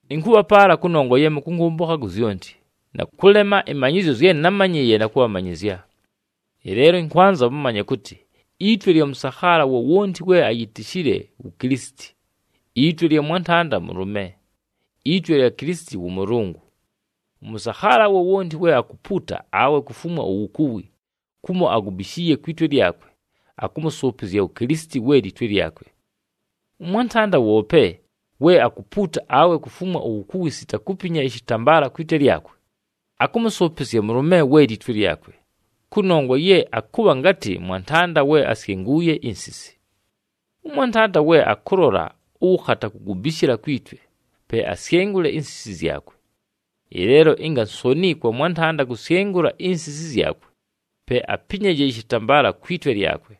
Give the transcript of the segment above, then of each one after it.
Ɨnkʉbhapaala kʉnongwa ye mʉkʉnkʉmbʉkha ku zyonti, na kʉlema ɨmanyɨzyo zye námanyɨɨye na kʉbhamanyɨzya. Ɨleelo ɨnkwanza mʉmanye kʉtɨ itwe lya mʉsakhaala wowonti we ayitishile wu Kilisiti, itwe lya mwantanda mʉlʉme, itwe lya Kilisiti wʉ Mʉlʉngʉ. Ʉmʉsakhaala wowonti we akupuuta awe kufumwa uwukuwi, kumo agubishiiye kwi twe lyakwe, akʉmʉsʉʉpɨzya wu Kilisiti we litwe lyakwe. Ʉmwantanda woope we akupuuta awe kufumwa uwukuwi sita kupinya ɨshɨtambaala kwi twe lyakwe, akʉmʉsʉʉpɨzya mʉlʉme we litwe lyakwe, kʉnongwa ye akʉbha ngatɨ mwantanda we asyenguuye insisi. Ʉmwantanda we akʉlola ʉwʉkhata kugubishila kwi twe, pe asyengule insisi zyakwe! Ɨleelo ɨnga nsoni kwa mwantanda kusyengulwa insisi zyakwe, pe apinyaje ɨshɨtambaala kwi twe lyakwe.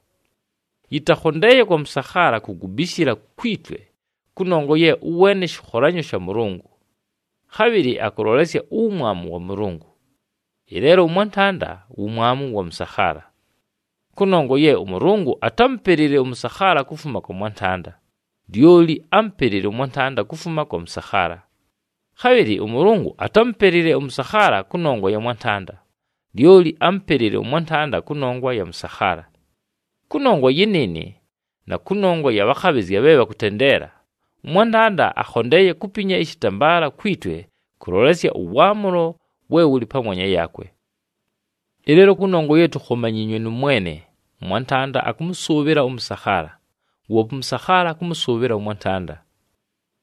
Yɨtakhondeeye kwa mʉsakhaala kugubishila kwi twe, kʉnongwa ye ʉweene shɨkholanyo sha Mʉlʉngʉ, khabhɨlɨ akʉlolesya uwumwamu wa Mʉlʉngʉ. Ɨleelo ʉmwantanda wumwamu wa mʉsakhaala. Kʉnongwa ye ʉMʉlʉngʉ atámupelile ʉmʉsakhaala kufuma kwa mwantanda, lyoli ámupelile ʉmwantanda kufuma kwa mʉsakhaala. Khabhɨlɨ ʉMʉlʉngʉ atámupelile ʉmʉsakhaala kʉnongwa ya mwantanda, lyoli ámupelile ʉmwantanda kʉnongwa ya mʉsakhaala. Kʉnongwa yɨnɨɨnɨ, na kʉnongwa ya bhakhabhɨzya bhe bhakʉtendeela, ʉmwantanda akhondeeye kupinya ɨshɨtambaala kwi twe kʉlolesya ʉwaamʉlo we wʉlɨ pamwanya yaakwe. Ɨleelo kʉnongwa ye tukhomanyiinywe nʉ Mwene, ʉmwantanda akʉmʉsʉʉbhɨla ʉmʉsakhaala, woope ʉmʉsakhaala akʉmʉsʉʉbhɨla ʉmwantanda.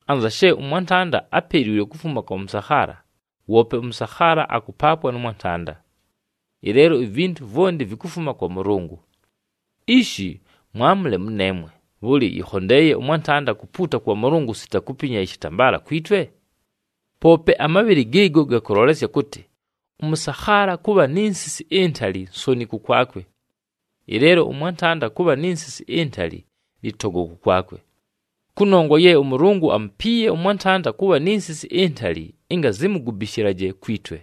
Anza she ʉmwantanda apeliilwe kufuma kwa mʉsakhaala, woope ʉmʉsakhaala akʉpaapwa nʉ mwantanda. Ɨleelo ivintu vwonti vikufuma kwa Mʉlʉngʉ. Ishi mwamʉle mʉneemwe, bhʉlɨ yɨkhondeeye ʉmwantanda kupuuta kwa Mʉlʉngʉ sita kupinya ɨshɨtambaala kwi twe? Poope, amabhɨlɨ gɨɨgo gakʉlolesya kʉtɨ ʉmʉsakhaala kʉbha ni nsisi intali nsoni kʉkwakwe! Ɨleelo ʉmwantanda kʉbha ni nsisi intali lɨtogo kʉkwakwe. Kʉnongwa ye ʉMʉlʉngʉ amupiiye ʉmwantanda kʉbha ni nsisi intali ɨnga zimugubishilaje kwi twe.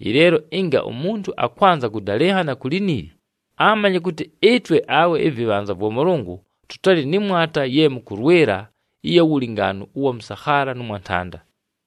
Ɨleelo ɨnga umuntu akwanza kʉdalɨnhana ku liniili, amanye kʉtɨ ɨtwe awe ɨvɨbhanza vwa Mʉlʉngʉ tʉtalɨ nɨ mwata ye mʉkʉlwɨla ɨya wulingaanu ʉwa mʉsakhaala nʉ mwantanda.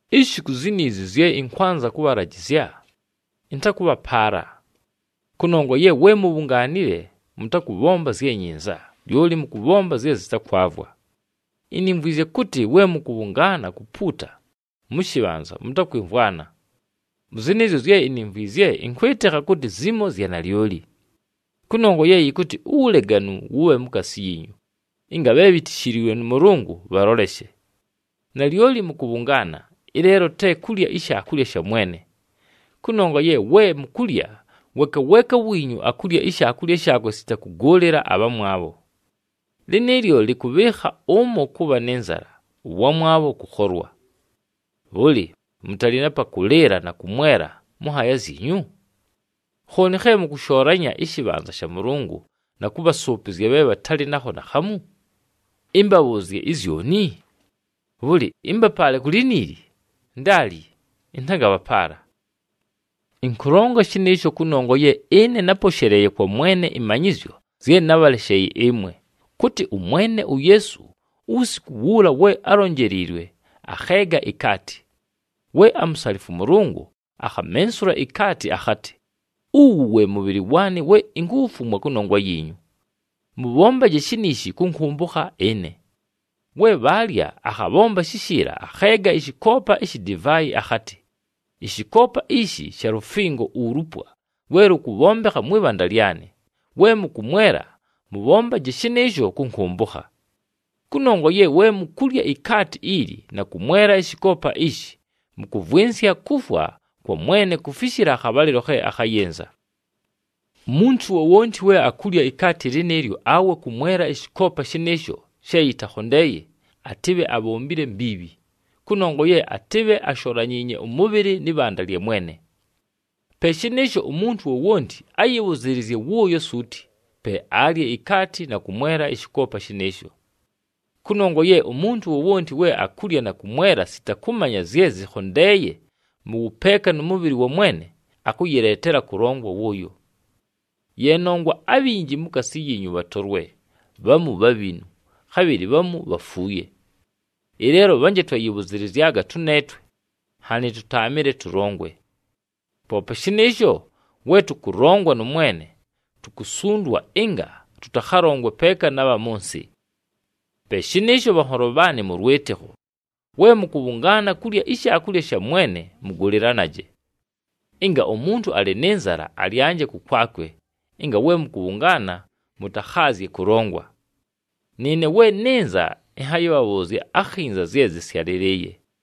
Ishi ku ziizi zye ɨnkwanza kʉbhalajɨzya, ɨntakʉbhapaala. Kʉnongwa ye we mubhungaanile mʉtakʉbhomba zye nyinza, lyoli mʉkʉbhomba zye zɨtakwavwa. Inimvwizye kʉtɨ we mʉkʉbhʉngaana kupuuta mʉ shɨbhanza mʉtakwɨmvwana. Mʉ zɨnɨɨzyo zye inimvwizye ɨnkwɨtɨkha kʉtɨ zimo zya nalyoli. Kʉnongwa ye yɨkʉtɨ uwuleganu wʉbhe mukaasi yiinyu, ɨnga bhe bhitishiliilwe nʉ Mʉlʉngʉ bhaloleshe. Nalyoli mʉkʉbhʉngaana, ɨleelo te kulya iShaakulya sha Mwene! Kʉnongwa ye we mukulya, weeka weeka wiinyu akulya ishaakulya shaakwe sita kʉgʉʉlɨla abhamwabho. Lɨnɨɨlyo lɨkʉbhɨɨkha ʉmo kʉbha nɨ nzala, ʉwamwabho kʉkholwa. Bhʉlɨ, mʉtalɨ na pa kʉlɨɨla na kʉmwela mʉ nhaaya zyinyu? Khooni khe mʉkʉshoolanya ɨshɨbhanza sha Mʉlʉngʉ na kʉbhasʉʉpɨzya bhe bhatalɨ nakho naakhamu? Ɨmbabhʉʉzye izyoni? Bhʉlɨ ɨmbapaale ku liniili? Ndaali! Ɨntangabhapaala. Ɨnkʉlonga shɨnɨɨsho kʉnongwa ye ɨne náposheleeye kwa Mwene ɨmanyɨzyo zye nábhalesheeye ɨmwe, kʉtɨ ʉMwene uYeesu uwusiku wuula we álonjeleliilwe, akheega ikaati. We amusalifwa ʉMʉlʉngʉ, akhamensula ikaati akhatɨ, “Uwu we mʉbhɨlɨ waanɨ we inkuwufumwa kʉnongwa yiinyu. Mʉbhombaje shiniishi kʉnkʉmbʉkha ɨne.” We bhaalya akhabhomba shishiila, akheega ɨshɨkoopa ishi divaayi akhatɨ, “Ɨshɨkoopa ishi sha lufingo ulupwa lwe lʉkʉbhombekha mwɨ bhanda lyanɨ. We mʉkʉmwela, mʉbhombaje shɨnɨɨsho kʉnkʉmbʉkha.” Kʉnongwa ye we mukulya ikaati ili na kʉmwela ɨshɨkoopa ishi, mʉkʉvwɨnsya kufwa kwa Mwene kufishila akhabhalɨlo khe akhayɨnza. Umuntu wowonti we akulya ikaati lɨnɨɨlyo awe kʉmwela ɨshɨkoopa shɨnɨɨsho she yɨtakhondeeye, atɨbhe abhombile mbiibhi, kʉnongwa ye atɨbhe asholanyiinye ʉmʉbhɨlɨ nɨ bhanda lya Mwene. Pe shɨnɨɨsho umuntu wowonti ayɨbhʉzɨɨlɨzye wʉʉyo suuti, pe alye ikaati na kʉmwela ɨshɨkoopa shɨnɨɨsho. Kʉnongwa ye umuntu wowonti we akulya na kʉmwelela sita kʉmanya zye zɨkhondeeye mʉ wʉpeeka nʉ mʉbhɨlɨ wa Mwene, akʉyɨleetela kʉlongwa wʉʉyo. Ye nongwa abhinji mukaasi yiinyu bhatolwe, bhamu bhabhinu, khabhɨlɨ bhamu bhafuuye. Ɨleelo bhanje twayɨbhʉzɨlɨzyaga tʉneetwe, nhanɨ tʉtaamɨle tʉlongwe. Poope shɨnɨɨsho, we tʉkʉlongwa nʉ Mwene, tukusundwa ɨnga tʉtakhalongwe peeka na bha mʉ nsɨ. Pe shɨnɨɨsho, bhanholo bhaanɨ mʉ lwɨtɨkho, we mʉkʉbhʉngaana kulya iShaakulya sha Mwene, mʉgʉlɨlanaje. Ɨnga umuntu alɨ nɨ nzala, alyanje kʉkwakwe, ɨnga we mʉkʉbhʉngaana mʉtakhaazye kʉlongwa. Nɨɨne we nɨnza ɨnhayɨbhabhʉʉzya akhinza zye zɨsyalɨlɨɨye.